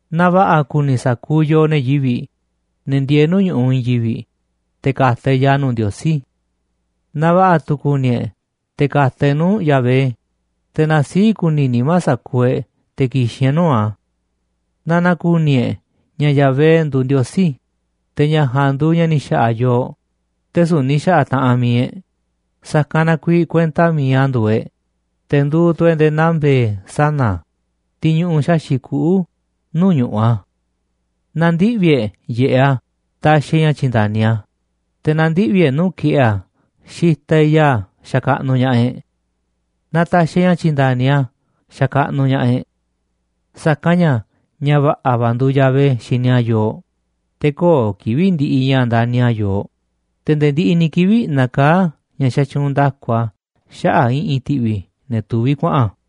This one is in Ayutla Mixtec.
Na va̱ꞌa̱ kuni sa̱kuuꞌ yooꞌ, ne̱ yivi̱ꞌ, ne̱ ndieeꞌ nuu̱ꞌ ñu̱ꞌuꞌ i̱i̱n yivi̱ꞌ, te̱ ka̱ta̱ e̱ꞌ ya̱a̱ nuu̱ꞌ Ndiosí. Na va̱ꞌa̱ tu̱ kuni e̱ꞌ te̱ ka̱ka̱ nu̱u̱ e̱ꞌ nuu̱ꞌ Yahvé, te̱ na sii̱ꞌ kuni nimá sa̱kuuꞌ e̱ꞌ te̱ ki̱xi̱n e̱ꞌ nuu̱ꞌ a̱. Na na̱ku̱ni̱ e̱ꞌ ña̱ Yahvé nduuꞌ Ndiosí, te̱ ña̱ ja̱a̱nꞌ nduuꞌ ña̱ ni̱ xa̱ꞌa̱ yooꞌ, te̱ süu̱ꞌ ni̱ xa̱ꞌa̱ taꞌanꞌ mi̱iꞌ e̱ꞌ, sa̱kanꞌ na kuiiꞌ kuenta mi̱iꞌ a̱ nduuꞌ e̱ꞌ, te̱ nduuꞌ tu̱ e̱ꞌ nde̱e̱ naa mbe̱e̱ sana̱ a̱, tiꞌ ñuꞌuꞌ xaxi̱ꞌ kuꞌu̱ nuu̱ꞌ ñu̱ꞌuꞌ a̱. Na ndiꞌvi̱ e̱ꞌ yiꞌeꞌ a̱ taxiꞌ e̱ꞌ ña̱ tyi̱nda̱ni a̱, te̱ na ndiꞌvi̱ e̱ꞌ nuu̱ꞌ ki̱ꞌe̱ a̱ xitaꞌ e̱ꞌ ya̱a̱ xakaꞌnuꞌ ña̱ꞌaꞌ e̱ꞌ. Na ta̱xi̱ e̱ꞌ ña̱ tyi̱nda̱ni a̱ xakaꞌnuꞌ ña̱ꞌaꞌ e̱ꞌ. Sa̱kanꞌ ña̱ ña̱ va̱ꞌa̱ va̱ nduuꞌ Yahvé xini a̱ yooꞌ, te̱ köo̱ꞌ kivi̱ꞌ ndiꞌiꞌ ña̱ ndani̱ a̱ yooꞌ, te̱ nde̱e̱ ndiꞌiꞌ ni̱ kivi̱ꞌ nakaá ña̱ xatyuunꞌ nda̱ku a̱ xaꞌa̱ꞌ i̱ꞌi̱n ti̱ꞌvi̱ ne̱ tuvi̱ kuaꞌa̱n.